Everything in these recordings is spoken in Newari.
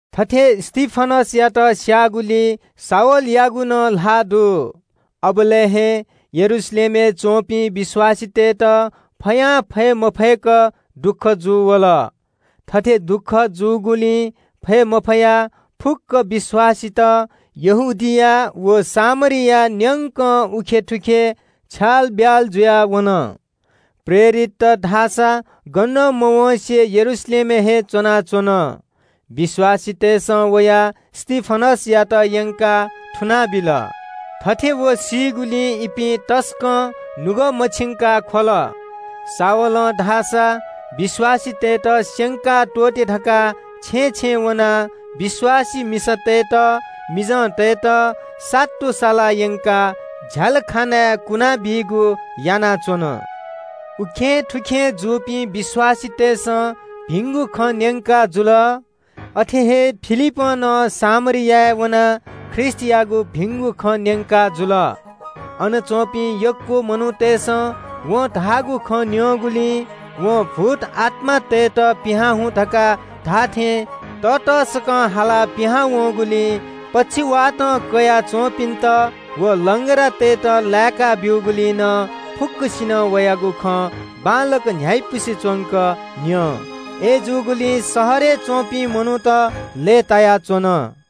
थथे स्‍तिफनसयात स्‍याःगुलिइ शाऊलयागु नं ल्‍हाः दु। अबलय् हे यरूशलेमय् च्‍वंपिं विश्‍वासीतय्‌त फयां फये मफय्‌क दुःख जूवल। थथे दुःख जूगुलिं फये मफयाः फुक्‍क विश्‍वासीत यहूदिया व सामरिया न्‍यंक उखेंथुखें छ्यालब्‍याल जुयाः वन। प्रेरितत धाःसा गनं मवँसे यरूशलेमय् हे च्‍वनाच्‍वन। सुं विश्‍वासीतय्‌सं वयाः स्‍तिफनसयात यंकाः थुनाबिल। थथे व सीगुलिं इपिं तसकं नुगः मछिंकाः ख्‍वल। शाऊलं धाःसा विश्‍वासीतय्‌त स्‍यंका हे त्‍वःते धकाः छेँय् छेँय् वनाः विश्‍वासी मिसातय्‌त मिजंतय्‌त सातुसालाः यंकाः झ्‍यालखानाय् कुना बीगु यानाच्‍वन। उखेंथुखें जूपिं विश्‍वासीतय्‌सं भिंगु खँ न्‍यंकाजुल। अथे हे फिलिपं नं सामरियाय् वनाः ख्रीष्‍टयागु भिंगु खँ न्‍यंकाजुल। अन च्‍वंपिं यक्‍व मनूतय्‌सं वं धाःगु खँ न्‍यंगुलिं, वं भूतआत्‍मातय्‌त पिहां हुँ धकाः धाःथें ततःसकं हालाः पिहां वंगुलिं, पक्षवातं कयाः च्‍वंपिन्‍त व लंग्रातय्‌त लाय्‌का ब्‍यूगुलिं नं फुक्‍कसिनं वयागु खँ बांलाक न्‍ह्याइपुसे च्‍वंक न्‍यं। अय्‌जूगुलिं शहरय् च्‍वंपिं मनूत लय्‌तायाच्‍वन।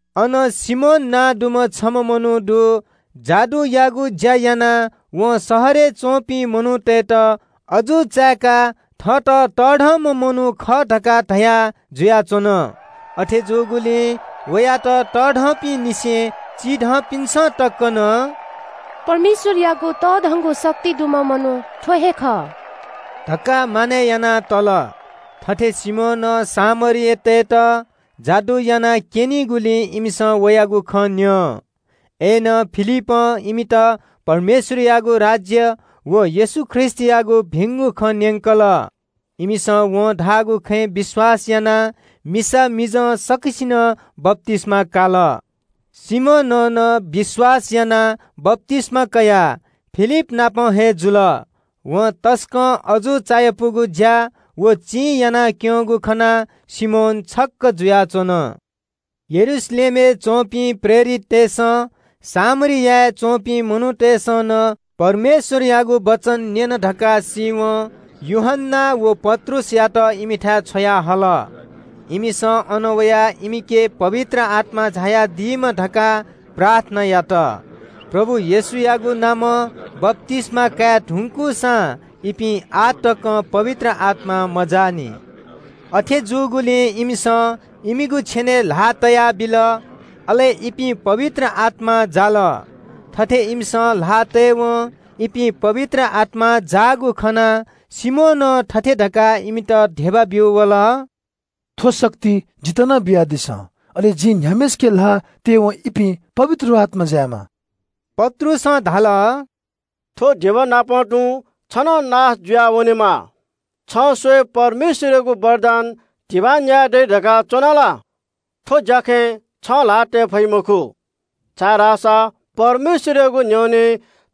अन सिमोन नां दुम्‍ह छम्‍ह मनू दु। जादुयागु ज्‍या यानाः वं शहरय् च्‍वंपिं मनूतय्‌त अजू चाय्‌काः थःत तःधंम्‍ह मनू खः धकाः धया जुयाच्‍वन। अथे जूगुलिं वयात चिधंपिंनिसें तःधंपिन्‍सं तक नं – “परमेश्‍वरयागु तःधंगु शक्ति दुम्‍ह मनू थ्‍व हे खः” धकाः मानय् याना तल। थथे सिमोनं ताःइलंनिसें सामरीतय्‌त जादु याना क्‍यनाच्‍वंगुलिं इमिसं वयागु खँ न्‍यं। अय्‌नं फिलिपं इमित परमेश्‍वरयागु राज्‍य व येशू ख्रीष्‍टयागु भिंगु खँ न्‍यंकल। इमिसं वं धाःगु खँय् विश्‍वास यानाः मिसा मिजं सकसिनं बप्‍तिस्‍मा काल। सिमोनं नं विश्‍वास यानाः बप्‍तिस्‍मा कयाः फिलिप नाप हे जुल। वं तसकं अजू चायापुगु ज्‍या व चिं यानाक्‍यंगु खनाः सिमोन छक्‍क जुयाच्‍वन। यरूशलेमय् च्‍वंपिं प्रेरिततय्‌सं सामरियाय् च्‍वंपिं मनूतय्‌सं नं परमेश्‍वरयागु वचन न्‍यन धकाः सीवं यूहन्‍ना व पत्रुसयात इमिथाय् छ्वयाहल। इमिसं अन वयाः इमिगु लागि पवित्र आत्‍मा झायादीमा धकाः प्रार्थना यात। प्रभु येशूयागु नामं बप्‍तिस्‍मा काये धुंकूसां इपिं आः तकं पवित्र आत्‍मां मजाःनि। अथे जूगुलिं इमिसं इमिगु छेनय् ल्‍हाः तयाबिल, अले इपिं पवित्र आत्‍मां जाल। थथे इमिसं ल्‍हाः तयेवं इपिं पवित्र आत्‍मां जाःगु खनाः सिमोनं थथे धकाः इमित धिबा ब्‍यू वल – “थ्‍व शक्ति जितः नं बियादिसँ। अले जिं न्‍ह्याम्‍हय्‌सिके ल्‍हाः तयेवं इपिं पवित्र आत्‍मां जायेमा।” पत्रुसं धाल – “थ्‍व धिबानापं तुं छ नं नाश जुयावनेमा। छं स्‍वये परमेश्‍वरयागु वरदान धिबां न्‍याये दइ धकाः च्‍वना ला? थ्‍व ज्‍याखँय् छं ल्‍हाः तये फइ मखु, छाय्‌धाःसा परमेश्‍वरयागु न्‍ह्यःने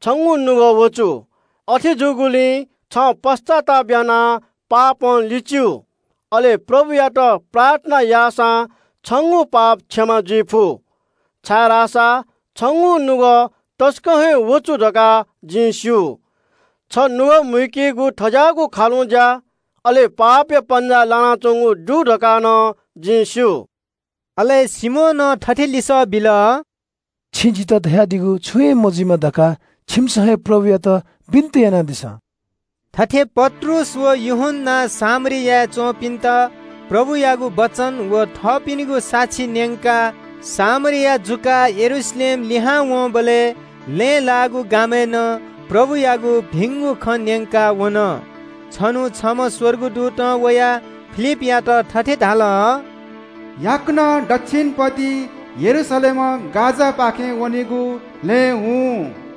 छंगु नुगः वँचु। अथे जूगुलिं छं पश्‍चाताप यानाः पापं लिच्‍यु। अले प्रभुयात प्रार्थना याःसा छंगु पाप क्षमा जुइफु, छाय्‌धाःसा छंगु नुगः तसकं हे वँचु धकाः जिं स्‍यू। छ तसकं नुगः मूम्‍ह व पापया पन्‍जाय् लानाच्‍वंम्‍ह खः धकाः नं जिं स्‍यू।” अले सिमोनं थथे लिसः बिल – “छिं जितः धयादीगु छुं हे मजुइमा धकाः छिकपिन्‍सं हे प्रभुयात बिन्‍ति यानादिसँ।” थथे पत्रुस व यूहन्‍नां सामरियाय् च्‍वंपिन्‍त प्रभुयागु वचन व थःपिनिगु साक्षी न्‍यंकाः सामरिया जुकाः यरूशलेम लिहां वंबलय् लँय् लाःगु गामय् नं प्रभुयागु भिंगु खँ न्‍यंका वन। छन्‍हु छम्‍ह स्‍वर्गदूतं वयाः फिलिपयात थथे धाल – “याकनं दच्‍छिन पतिइ यरूशलेमं गाजापाखे वनेगु मरुभूमिया लँय् हुँ।”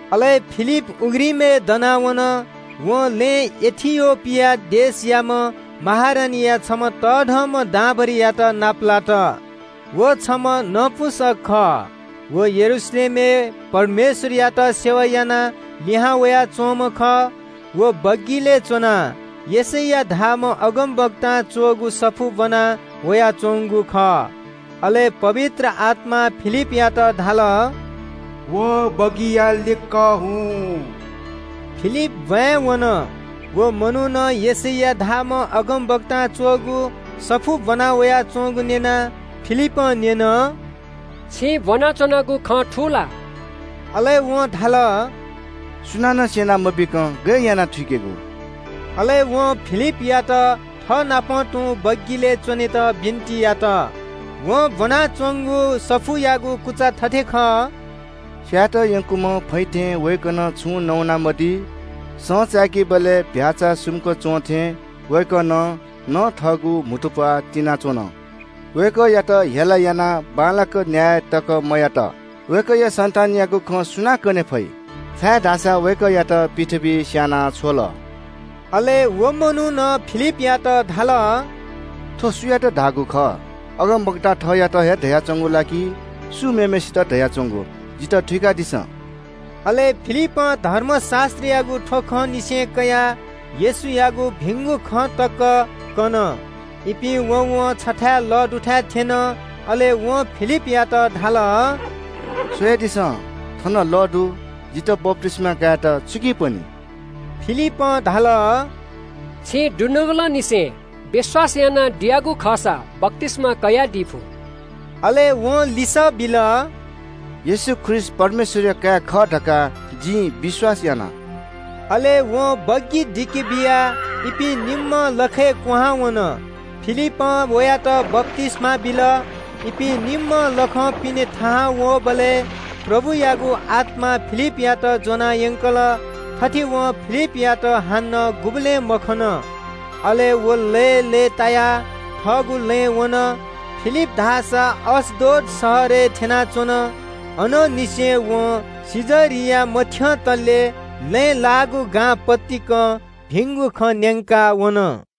अले फिलिप उघ्रिमय् दनाः वन। वं लँय् इथियोपिया देशयाम्‍ह महारानीया छम्‍ह तःधंम्‍ह दांभरिंयात नापलात। व छम्‍ह नपुंसक खः। व यरूशलेमय् परमेश्‍वरयात आराधना यानाः लिहां वयाच्‍वंम्‍ह खः। व बग्‍गिलय् च्‍वनाः यशैया धाःम्‍ह अगमवक्तां च्‍वःगु सफू ब्‍वना वयाच्‍वंगु खः। अले पवित्र आत्‍मां फिलिपयात धाल – “व बग्‍गिया लिक्‍क हुँ।” फिलिप ब्‍वाँय् वन, व मनुखं यशैया धाःम्‍ह अगमवक्तां च्‍वःगु सफू ब्‍वना वयाच्‍वंगु न्‍यनाः फिलिपं न्‍यन – “छिं ब्‍वनाच्‍वनागु खँ थू ला?” अले वं धाल – “सुनानं स्‍यना मबीकं गय् यानाः थुइकेगु?” अले वं फिलिपयात थःनाप तुं बग्‍गिलय् च्‍वनेत बिन्‍ति यात। वं ब्‍वनाच्‍वंगु सफूयागु ब्‍व थथे खः – “स्‍यायेत यंकूम्‍ह चीधिकःम्‍ह भ्‍याःचा थें वय्‌कलं छुं नवाना मदी। सँ चाकीबलय् फै सुम्‍क च्‍वंथें वय्‌कलं नं थःगु म्‍हुतुप्‍वाः तिनाच्‍वन। वय्‌कःयात क्‍वह्यंकाः बांलाक न्‍याय तकं मयात। वय्‌कःया सन्‍तानयागु खँ सुनां कनी? छाय्‌धाःसा वय्‌कःयात पृथ्‍वीइ स्‍यानाबिल।” अले व मनुखं फिलिपयात धाल – “थ्‍व सुयात धाःगु खः? अगमवक्तां थःत हे धयाच्‍वंगु ला कि सुं मेम्‍हय्‌सित हे धयाच्‍वंगु? जितः थुइकादिसँ।” अले फिलिपं धर्मशास्‍त्रयागु थ्‍व खंनिसें कयाः येशूयागु भिंगु खँ तक कन। इपिं वँवं छथाय् लः दुथाय् थ्‍यन। अले वं फिलिपयात धाल – “स्‍वयादिसँ, थन लः दु। जितः बप्‍तिस्‍मा कायेत छुकिं पनी?” फिलिपं धाल – “छिं दुनुगलंनिसें विश्‍वास यानादियागु खःसा बप्‍तिस्‍मा कयादी फु।” अले वं लिसः बिल – “येशू ख्रीष्‍ट परमेश्‍वरया काय् खः धकाः जिं विश्‍वास याना।” अले वं बग्‍गी दिके बियाः इपिं निम्‍हं लखय् क्‍वहां वन। फिलिपं वयात बप्‍तिस्‍मा बिल। इपिं निम्‍हं लखं पिने थाहां वःबलय् प्रभुयागु आत्‍मां फिलिपयात ज्‍वना यंकल। थथे वं फिलिपयात हानं गुबलें मखन। अले व लय्‌लय्‌तायाः थःगु लँय् वन। फिलिप धाःसा अश्‍दोद शहरय् थ्‍यनाच्‍वन। अनंनिसें वं कैसरिया मथ्‍यंतले लँय् लाःगु गां पतिकं भिंगु खँ न्‍यंका वन।